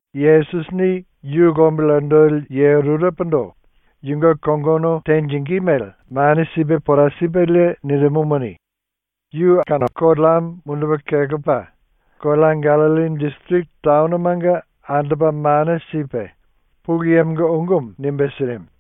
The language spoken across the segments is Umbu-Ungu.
Yesusini yu lombili andoli ye rurepondo yunge kongono tenjingí mele mane sipe pora sipelie nirimumuni, yu aku koleamo mundupe kelepa kolea Gallilli disiriki taonomanga andopa mane sipe ⸤Pulu Yemonga⸥ ungumu nimbe sirimu.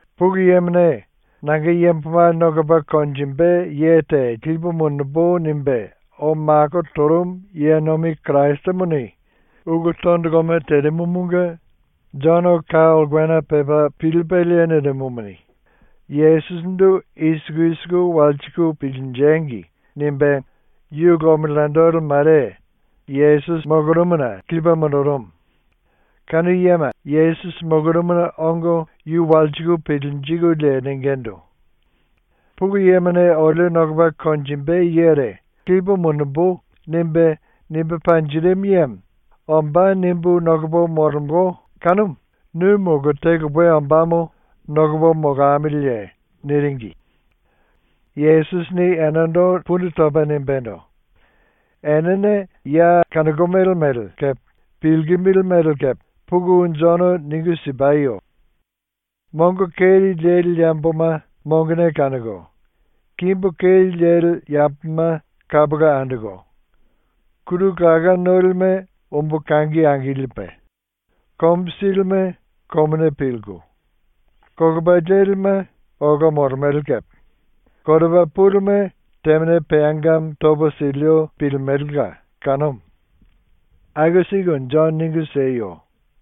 ⸤Pulu Yemone “Nanga yamboma nokopa konjimbe ye te lipu mundumbu.” nimbe ou mako torumu ye nomi⸥ Kirasimuni ulu tondoloma terimumunge Jono ka ulkena pepa pilipelie nirimumuni, “Yesusindu i siku i siku walsiku pilinjengi!” nimbe yu lombili andoli mare Yesusi molorumuna lipe mundurumu. Kanu yema Yesusi molorumuna ongo yu walsiku pilinjikulie ningindu: “Pulu Yemone olio nokopa konjimbe yere “Lipu mundumbu.” nimbe, nimbe panjirimu yemo ‘Ombá.’ nimbu nokopo molemolo kanumu nu molo te lupe ombámo nokopo molamiliye?” niringi. Yesusini enendo pundu topa nimbendo: “Enene ya kanokomele mele kepe pilkimili mele kepe puku Jono ningu sipayo. Mongo keri leli yamboma mongone kanoko, kimbu keri leli yamboma kapola andoko, kuru laká nolime umbu kangi angilipe, komu silime komuni pilku, kolopa lelime ola molemele kepe, koropa pulime temane peangamo topo silio pilimelela kanumu. Aku siku Jono ningu sieyo.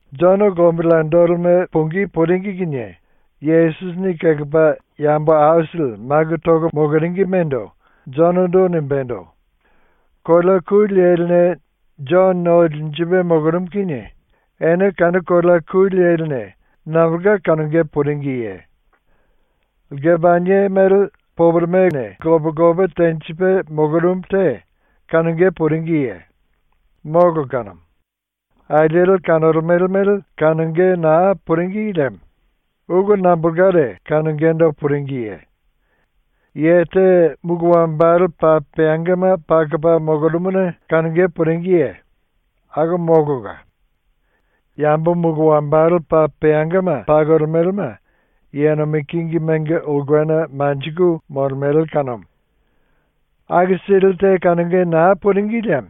Jono lombili andolime pungí puringi kinie Yesusini kelepa yambo aisili maku toko moloringimendo Jonondo nimbendo: “⸤Kolea ku leline Jono no linjipe molorumu kinie⸥ ene kanu kolea ku leline nambolka kanonge puringiye? Lkepanie mele poporomene lope lope tenjipe molorumu te kanonge puringiye? ⸤Molo kanumu. Alieli kanolemele mele kanonge naa puringi liemo⸥ ulu nambolkare kanongendo puringiye? Ye te mulu wambale paa peangama pakopa molorumuna kanonge puringiye? Akumu molola. Yambo mulu wambale paa peangama pakolemelema ye nomi kingimenga ulkena manjiku molemele kanumu. “⸤Aku sili te kanonge na puringi liemo⸥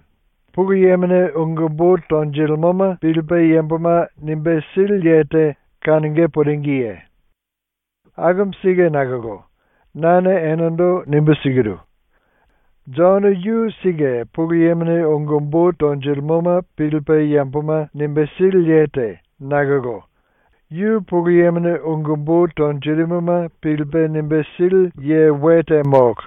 Pulu Yemone ungu umbu tonjilimoma pilipe yamboma nimbe sili ye te kanonge puringiye? Akumu sike nakolo nane enendo nimbu sikiru: Jono yu sike Pulu Yemone ungu umbu tonjilimoma pilipe yamboma nimbe sili ye te nakolo yu Pulu Yemone ungu umbu tonjirimuma pilipe nimbe sili ye we te molo.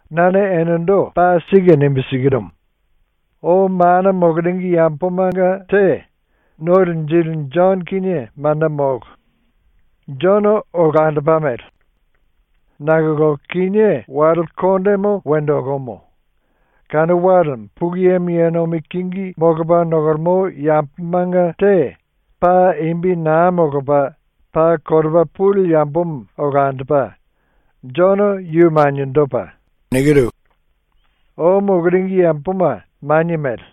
Nane enendo paa sike nimbu sikirumu: Ou mana moloringi yambomanga te No Linjili Jono kinie manda molo. Jono olandopa mele. Nakolo kinié wale kondemo wendo okomo. Kanu walemo Pulu Yemo ye nomi kingi molopa nokolemo yambomanga te paa imbi naa molopa paa koropa puli yambomo olandopa; Jono yu maniendopa. ⸤Ou moloringi yamboma manie mele;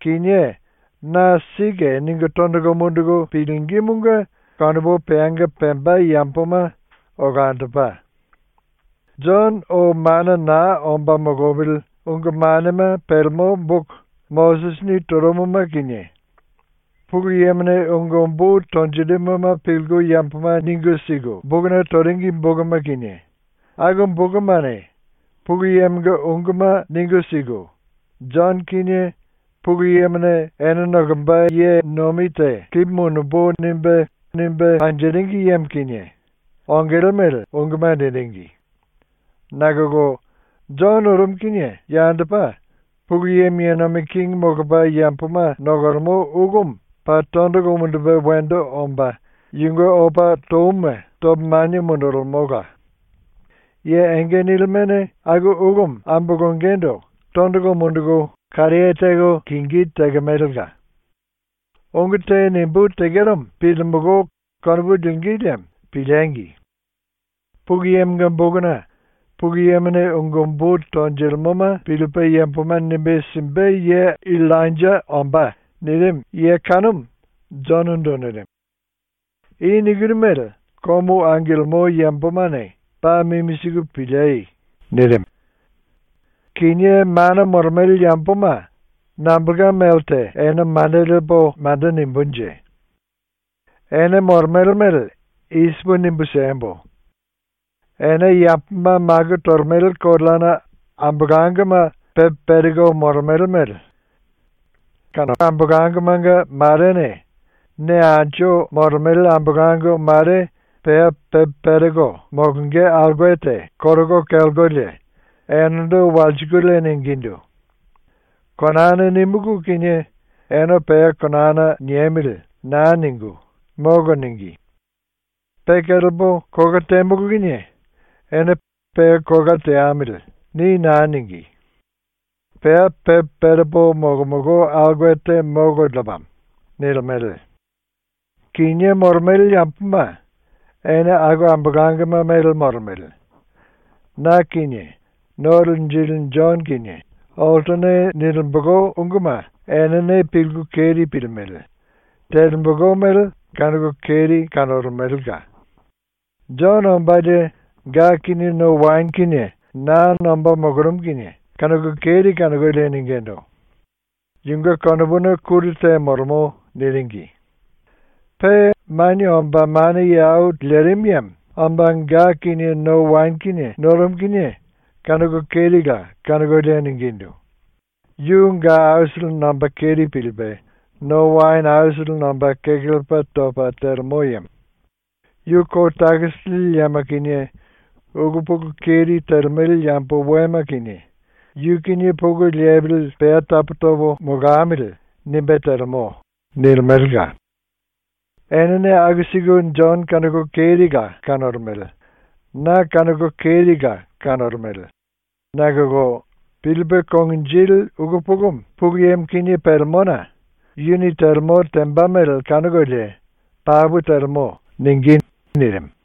kinié na ‘Sike.’ ningu tondolo munduku pilingímunge konopu peanga pemba yamboma olandopa.⸥ Jono ou mana na omba molopili ungu manema pelemo boku Mosisini torumuma kinie, Pulu Yemone ungu umbu tonjirimuma pilku yamboma ningu siku bokuna toringi bokuma kinie, aku bokumane Pulu Yemonga unguma ningu siku, Jono kinie Pulu Yemone “Ene nokomba ye nomi te lipu mundumbu.” nimbe panjirimu yemo kinie ongele mele unguma niringi. Nakolo Jono orumu kinie yandopa Pulu Yemo ye nomi kingi molopa yamboma nokolemo ulumu paa tondolo mundupe wendo omba yunge opa touma topa manie mundulimola; ye enge nilimene aku ulumu ambolongendo tondolo munduku karaye teko lingí tekemelela. Ungu te nimbú tekeromo pilimulú konopu lingí liemo piliengi! Pulu Yemonga bokuna “⸤Pulu Yemone ungu umbu tonjilimoma pilipe yamboma nimbe simbe ye⸥ Illainja ombá.” nirimu ye kanumu Jonondo nirimu. I nikiru mele komu angilimo yambomane paa mimi siku piliei!” ⸤nirimu.⸥ “Kinié mana molemele yamboma nambolka melte ene manda lepo manda nimbunje? ⸤Ene molemele mele i sipu nimbu siembo:⸥ Ene yamboma maku tolemele koleana ambolangoma pepe pereko molemele mele. Aku ambolangomanga marene ne anju molemele ambolango mare ⸤pea pepe pereko molonge aulke te koroko kelkolie⸥ enendo walsikulie ningindu: “Konana nímulu kinie ene ‘Pea konana niemili.’ na ningu “Molo.” níngi. Pe kelepo kola temulu kinie ene ‘Pea kola teamili.’ ni na níngi. ⸤Pea pepe perepo molomolo aulke te molo lepamo.⸥” nilimele. ⸤Kinié molemele yamboma ene aku ambolangoma mele molemele.⸥ ⸤Na kinie No Linjili Jono kinie oltone nilimbolo unguma enene pilku keri pilimele; telembolo mele kanoko keri kanolemelela⸥. Jono ombalie ga kinie no waene kinie na nomba molorumu kinie ⸤kanoko keri kanokolie⸥ ningindu: “Yunge konopuna kuru te molemo.” niringi. Pe Manie Omba Mana Ye Au Lerimu Yemo omba ga kinie no waene kinie norumu kinie ⸤kanoko kerila kanokolie⸥ ningindu: “Yu ga aisili nomba keri pilipe, no waene aisili nomba kekelepa topa telemo yemo. Yu kou takisi lili yema kinie, ulu pulu keri telemele yambo wema kinie ‘Yu kinie pulu lepili pea tapu topo molamili.’ nimbe telemo.” nilimelela. ⸤Enene aku siku Jono kanoko kerila kanolemele. Na kanoko kerila kanolemele.⸥ Nakolo pilipe konginjili ulu pulumu Pulu Yemo kinie pelemona yuni telemo temba mele kanokolie ‘Papu telemo.’ ningí.” nirimu.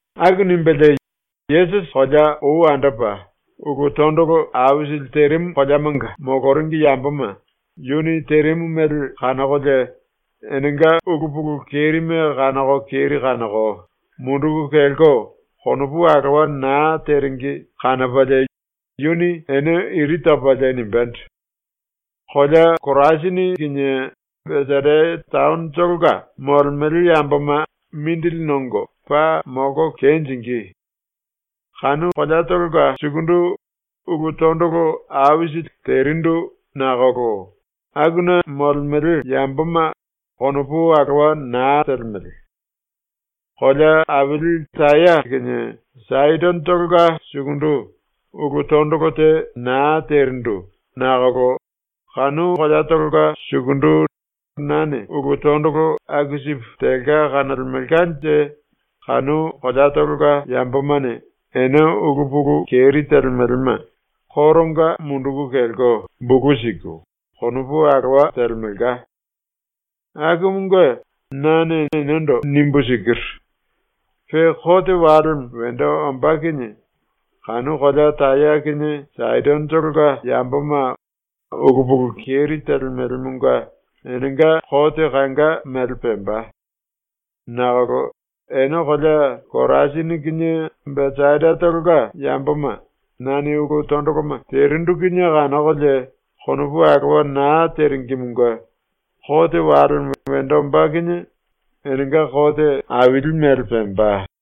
Aku nimbelie Yesusi kolea ou andopa ulu tondolo aisili terimu koleamanga ⸤moloringi yamboma⸥ yuni terimu mele kanokolie enenga ulu pulu kerime kanoko keri kanoko munduku kelko konopu alowa naa teringi kanopalie yuni ene iri topalie nimbendo: “Kolea Korasini kinie Besaida taonotolonga ⸤molemele yamboma⸥ mindili nongo paa molko kenjingí! Kanu koleatolonga sukundu ulu tondolo aisili terindu ⸤nakolo akuna molemele yamboma konopu alowa naa telemele⸥. Kolea aili Taya kinie Saidonotolonga sukundu ⸤ulu tondolo te naa terindu nakolo kanu koleatolonga sukundu⸥ nane ulu tondolo aku sipu telka kanolemelkanje kanu koleatolonga ⸤yambomane⸥ ene ulu pulu keri telemelema koronga munduku kelko, bulu siku, konopu alowa telemelka. Akumunge nane enendo nimbu sikiru: Pe kote walemo wendo ombá kinie kanu kolea Taya kinie Saidonotolonga ⸤yamboma ulu pulu keri telemelemonga⸥ enenga kote kanga mele pemba. Nakolo ene kolea Korasini kinie Besaidatolonga ⸤yamboma nane ulu tondoloma terindu kinie kanokolie konopu alowa naa teringimunge⸥ kote walemo wendo ombá kinie enenga kote aili mele pemba.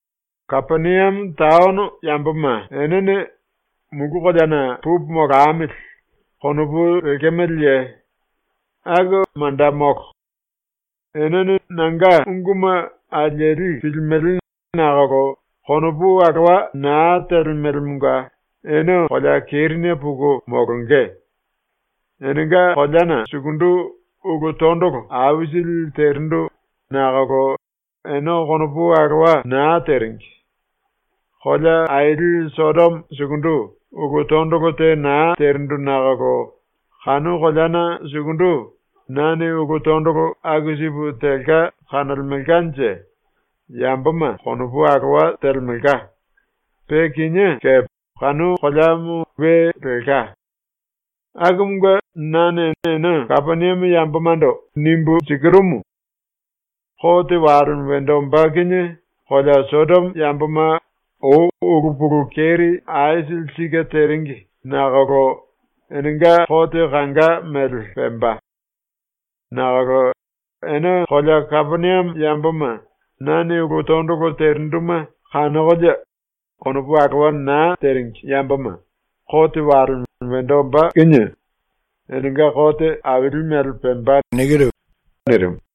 “Kapeniame taono ⸤yamboma enene⸥ ‘Mulu koleana pupu molamili.’ konopu lekemeleye? Aku manda molo. ⸤Enene nanga unguma alieli pilimele nakolo konopu alowa naa telemelemonga⸥ ene kolea kerine puku molonge. Enenga koleana sukundu ulu tondolo aisili terindu ⸤nakolo ene konopu alowa na teringi⸥. Kolea aili Sodomo sukundu ⸤ulu tondolo te na terindu nakolo kanu koleana sukundu⸥ nane ulu tondolo aku sipu telka kanolemelkanje yamboma konopu alowa telemelka, pe kinié kepe kanu koleamo we lelka. Akumunge nane ene ⸤Kapeniame yambomando⸥ nimbu sikirumu: Kote walemo wendo ombá kinie kolea Sodomo ⸤yamboma ou ulu pulu keri aisili sike teringi nakolo⸥ enenga kote kanga mele pemba. Nakolo ene kolea Kapeniame ⸤yamboma nane ulu tondolo terinduma kanokolie konopu alowa na teringi yamboma,⸥ kote walemo wendo ombá kinie enenga kote aili mele pemba.” nirimu.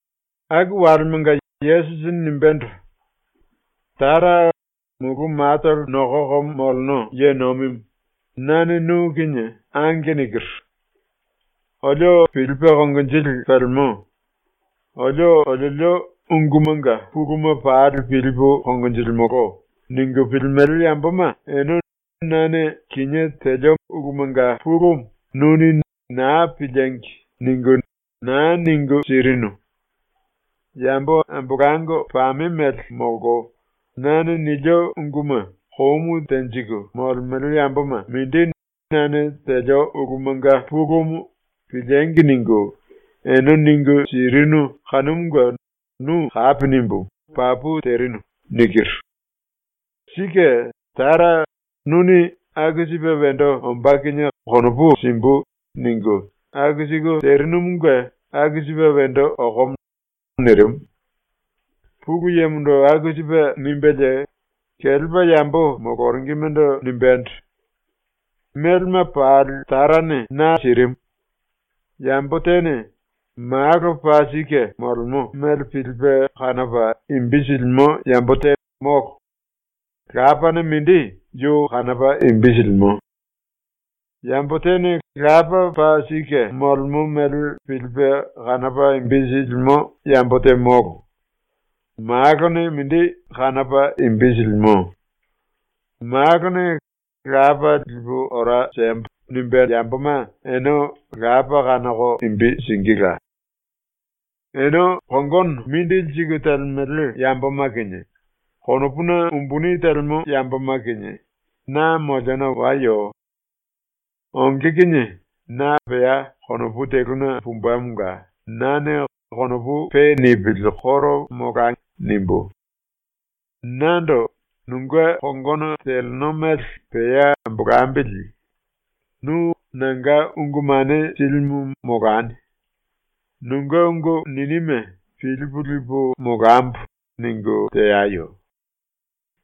Aku walemanga Yesusini nimbendo: “Tara, Mulu Matolo Nokoko Moleno Ye Nomimu, nane nu kinie ‘Ange’ nikiru. “Olio pilipe konginjili pelemo. Olio oliolio ungumanga puluma pali pilipu konjilimolo.” ningu pilimele yamboma ene nane kinié telio ulumanga pulumu nuni ‘Naa piliengi!’ ningu naa ningu sirinu. Yambo ambolango pame mele molko nane nilio unguma komu tenjiku molemele yamboma mindi nane telio ulumanga pulumu ‘Piliengi!’ ningu, ene ningu sirinu kanumunge nu kapi nimbu ‘Papu terinu.’ nikiru. Sike, Tara, nuni ‘aku sipe wendo ombá kinie konopu simbu.’ ningu aku siku terinumunge ⸤aku sipe wendo okomo⸥.” ⸤nirimu.⸥ ⸤Pulu Yemondo aku sipe nimbelie kelepa yambo moloringimendo nimbendo:⸥ “Melema pali Tarane na sirimu. Yambo tene Malo paa sike molemo mele pilipe kanopa imbi silimo yambo te molo; Lapane mindi yu kanopa imbi silimo. Yambo tene Lapa paa sike molemo mele pilipe kanopa imbi silimo yambo te molo. Malone mindi kanopa imbi silimo; Malone ‘Lapa lipu ora siembo.’ nimbé yamboma ene Lapa kanoko imbi singíla. “Ene kongono mindili siku telemele yamboma kinie, konopuna umbuni telemo yamboma kinie, na moliona wayo. Onge kinie na pea konopu teluna pumbemonga nane ‘Konopu pe nipili koro molai.’ nimbú. Nando “Nunge kongono teleno mele pea ambolambili. Nu nanga ungu mane silimu molani. Nunge ungu ninime pilipu lipu molambo.” ningu teayo.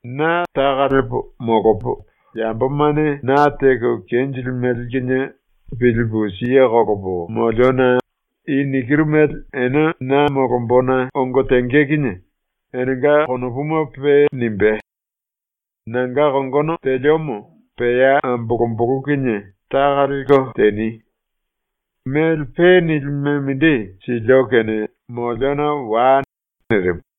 Na taka lepo molopo, yambomane na teko kenjilimele kinie pilipu siye kolopo moliona i nikiru mele ene na molombona ongo tenge kinie enenga konopuma pe nimbe. Nanga kongono teliomo pea ambolombolo kinie taka lelko teni. Mele pe nilime mindi silio kene moliona wai.” nirimu.